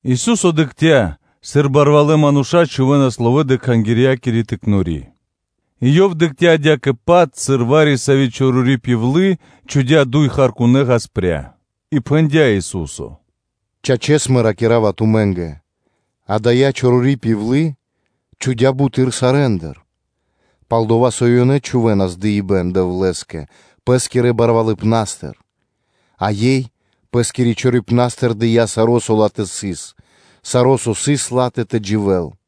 Ису́со дыкхця́, сыр барвалэ́ мануша́ чхувэ́нас ловэ́ дрэ Кхангирья́кири пиралы́ (тыкнори); и Ёв дыкхця́ адя́кэ-паць, сыр вари-сави́ чорори пивлы (удова) чхудя́ дуй харкунэ́ (меди́тка) ‘гаспря (лепты). И пхэндя́ Ису́со: “Чачэс, Мэ ракира́ва тумэ́нгэ: ада́я чорори пивлы чхудя́ буты́р сарэ́ндыр; пал-дова́ со ёнэ чхувэ́нас дыибэ́н Дэвлэ́скэ пэ́скирэ барвалыпнастыр; а ёй пэ́скирэ чорорипнастыр дыя́ саро́, со ла́тэ сыс; саро́ со сыс ла́тэ тэ дживэ́л.”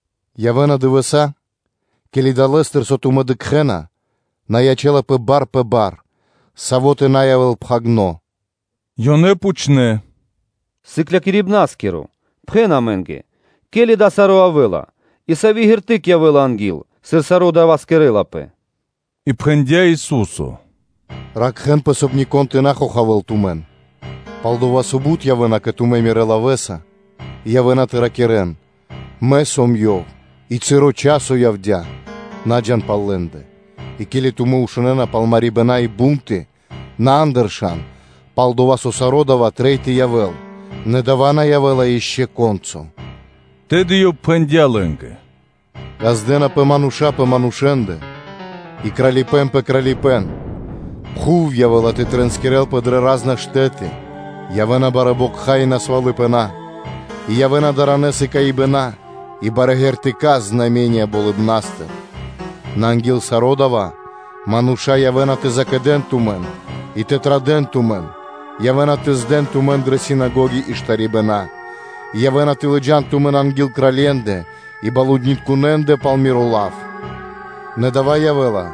“Явэ́на дывэса́, ке́ли далэ́стыр, со тумэ́ дыкхэ́на, на ячэ́лапэ бар пэ бар; саво́ тэ на явэ́л пхагирдо́.” Ёнэ пхучнэ́: “Сыклякирибна́скиро! Пхэн амэ́нгэ, ке́ли дава́ саро́ явэ́ла и сави́ шпэ́ра (примета) явэ́ла анги́л, сыр саро́ дава́ кэрэ́лапэ?” И пхэндя́ Ису́со: “Ракхэ́нпэ, соб (кай) нико́н тэ на хохавэ́л тумэн, пал-дова́ со бут явэ́на кэ тумэ́ Мирэ́ лавэ́са и явэ́на тэ ракирэ́н: ‘Мэ сом Ёв,’ и ‘Часо явдя́;’ на джа́н пал лэ́ндэ. И ке́ли тумэ́ шунэ́на пал марибэна и бунты, на андыршан; пал-дова́ со саро́ дава́ трэй тэ явэ́л; нэ дава́ на явэ́ла ишчо (инкэ́) ко́нцо (яго́ро).” Тэды Ёв пхэндя́ лэ́нгэ: “Ѓаздэнапэ мануша́ пэ манушэ́ндэ и кралипэ́н пэ кралипэ́н; пхув явэ́ла тэ тринскирэлпэ дрэ ра́зна штэ́ты, явэ́на барэ́ бокха и мэрибнытка фра́нсы, и явэ́на даранэ сыкаибэна и барэ́ знаме́нии (ґертыка́) болыбна́стыр. Нэ анги́л саро́ дава́ мануша́ явэ́на тэ закэдэн тумэн и тэ традэ́н тумэн, явэ́на тэ здэн тумэн дрэ синагоги и штарибэна; и явэ́на тэ лыджа́н тумэн анги́л кралье́ндэ и балунитконэндэ пал Миро лав; нэ дава́ явэ́ла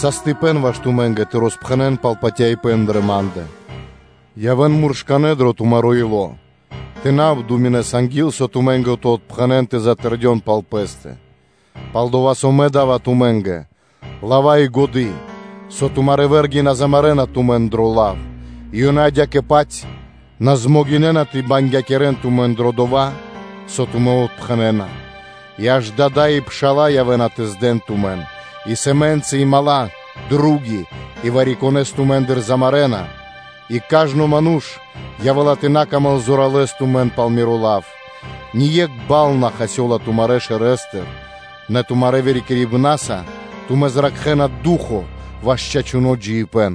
саштыпэн ваш тумэ́нгэ тэ роспхэнэ́н пал патяибэ́н дрэ Ма́ндэ. Явэ́н муршканэ́ дро тумаро́ ило́ тэ на обдуминэн анги́л, со тумэ́нгэ тэ отпхэнэн тэ затэрдён пал пэ́стэ; пал-дова́ со Мэ да́ва тумэ́нгэ лава́ и годы́, со тумарэ́ вэ́рги на змарэна тумэн дро лав, и ёнэ адя́кэ-паць на дэ́на ра́да (на змогинэна) тэ бангякирэн тумэн дро дова́, со тумэ́ отпхэнэна. И аж дада́ и пша́ла явэ́на тэ здэн тумэн, и сэмэнцы и дру́ги (мала́), и вари-конэ́с тумэ́ндыр замарэна; и кажно ману́ш явэ́ла тэ на сыкавэ́л паты́в зоралэ́с тумэ́нгэ пал Миро лав. Нэ ние́кх бал на хасёла тумарэ́ шэрэстыр. Нэ тумарэ́ вырикирибнаса тумэ́ зракхэна ду́хо (фа́но) ваш чачуно́ джиибэ́н.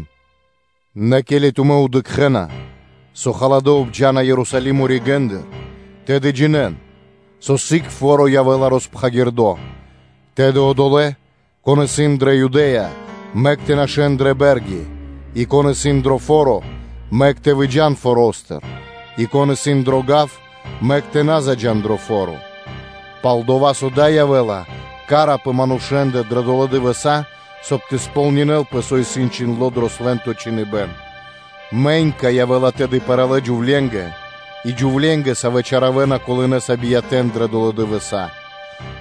Нэ ке́ли тумэ́ дыкхэ́на, со халадэ́ обджана Ерусалимо ригэ́ндыр, тэды джинэ́н, со сыг явэ́ла голоты́ня. Тэды одолэ́, кон исын дрэ Юдэ́я, мэк тэ нашэ́н дрэ бэ́рги, и кон исын дро фо́ро, мэк тэ выджа́н форо́стыр; и кон исын дро гав, мэк тэ на заджа́л дро фо́ро: пал-дова́ со дава́ явэ́ла ка́ра пэ манушэ́ндэ дрэ долэ́ дывэса́, соб (кай) тэ сполнинэ́лпэ, со исын чхиндло́ дро Свэ́нто Чхиныбэ́н. Мэнька явэ́ла тэды пэралэ джувленгэ и джувленгэ, савэ́ чаравэна колынэса биятэ́н дрэ долэ́ дывэса́;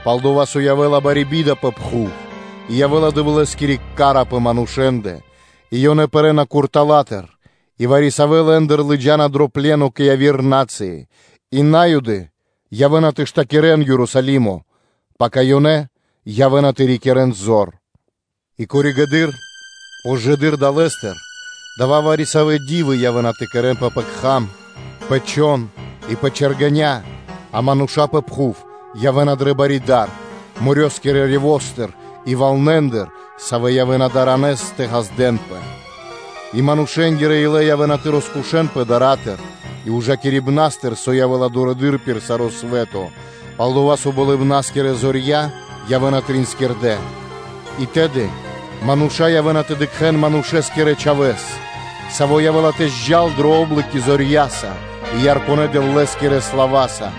пал-дова́ со явэ́ла бари би́да пэ пхув и явэ́ла Дэвлэ́скири ка́ра пэ манушэ́ндэ. И ёнэ пэрэ́на куртала́тыр и вари-савэ́н лэ́ндыр лыджа́на дро пле́но кэ яви́р на́цыи; и На́юды явэ́на тэ штакирэн Ерусалимо, пака ёнэ явэ́на тэ рикирэ́н зор. И коригэды́р (позжэ) далэ́стыр вари-савэ́ знаме́нии (ґертыка́) явэ́на тэ кэрэнпэ пэ кхам, пэ чхон и пэ чэргэня́, а манушэ́ндэ пэ пхув явэ́ла дукх пэ ило́, морёскирэ (дэрьявэ́скирэ) рёвостыр и валнэндыр, савэ́ явэ́на даранэс тэ ґаздэ́нпэ; и манушэ́нгирэ илэ явэ́на тэ роскошэнпэ дара́тыр и ужакирибнастыр, со явэ́ла дурэды́р пир саро́ свэ́то, пал-дова́ со болыбна́скирэ зорья явэ́на тринскирдэ. И тэды мануша́ явэ́на тэ дыкхэ́н Манушэ́скирэ Чхавэ́с, Саво́ явэ́ла тэ джал тэлэ́ дрэ о́блоки зорья́са и ярконэ Дэвлэ́скирэ слава́са.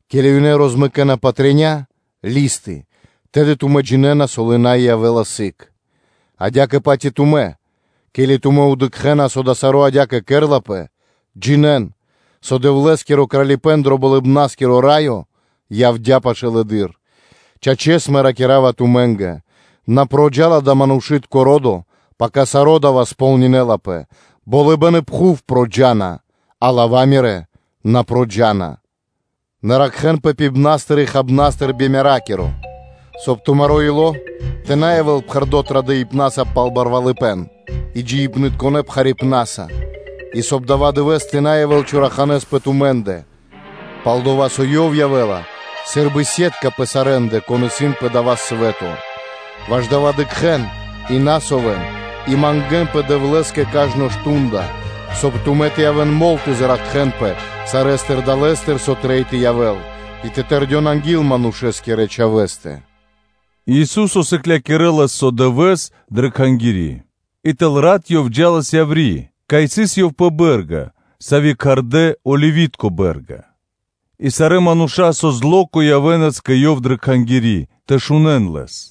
ке́ли ёнэ розмэкэна патря (листы), тэды тумэ́ джинэ́на, со лынай (милай) явэ́ла сыг. Адя́кэ-паць и тумэ́, ке́ли тумэ́ дыкхэ́на, со дава́ саро́ адя́кэ кэрлапэ, джинэ́н, со Дэвлэ́скиро Кралипэ́н дро Болыбна́скиро Раё явдя́ пашылэды́р. Чачэс, Мэ ракира́ва тумэ́нгэ: на проджа́ла (накхэла) дава́ манушы́тко ро́до, пака саро́ дава́ кэрэ́лапэ кэ ко́нцо/яго́ро (сполнинэлапэ). Болыбэ́н и пхув проджа́на, а лава́ Мирэ́ на проджа́на (накхэна). Нэ ракхэ́нпэ кокорэ́ пибнастыр и хабнастыр би меракиро, соб (кай) тумаро́ ило́ тэ на явэ́л пхэрдо́ традыпнаса пал барвалыпэ́н и джиибнытконэ пхарипнаса, и, соб (кай) дава́ дывэ́с тэ на явэ́л чораханэ́с пэ тумэ́ндэ; пал-дова́ со ёв явэ́ла сы́рбы фэлы́ (сетка) пэ сарэ́ндэ, кон исын дро дава́ свэ́то. Ваш дава́ дыкхэ́н и на совэн и мангэ́нпэ Дэвлэ́скэ кажно часо, соб (кай) тумэ́ тэ явэ́н мол тэ зракхэнпэ сарэ́стыр далэ́стыр, со трэй тэ явэ́л, и тэ тэрдён анги́л Манушэ́скирэ Чхавэ́стэ.” И Ису́со сыклякирэлас со дывэ́с дрэ Кхангири́, и тэл рат Ёв джа́лас яври́, кай сыс Ёв пэ бэ́рга, сави́ кхардэ́ “Оливи́тко Бэ́рга”; и сарэ́ мануша́ кажно зло́ко (ра́нко) явэ́нас кэ Ёв дрэ Кхангири́ тэ шунэ́н Лэс.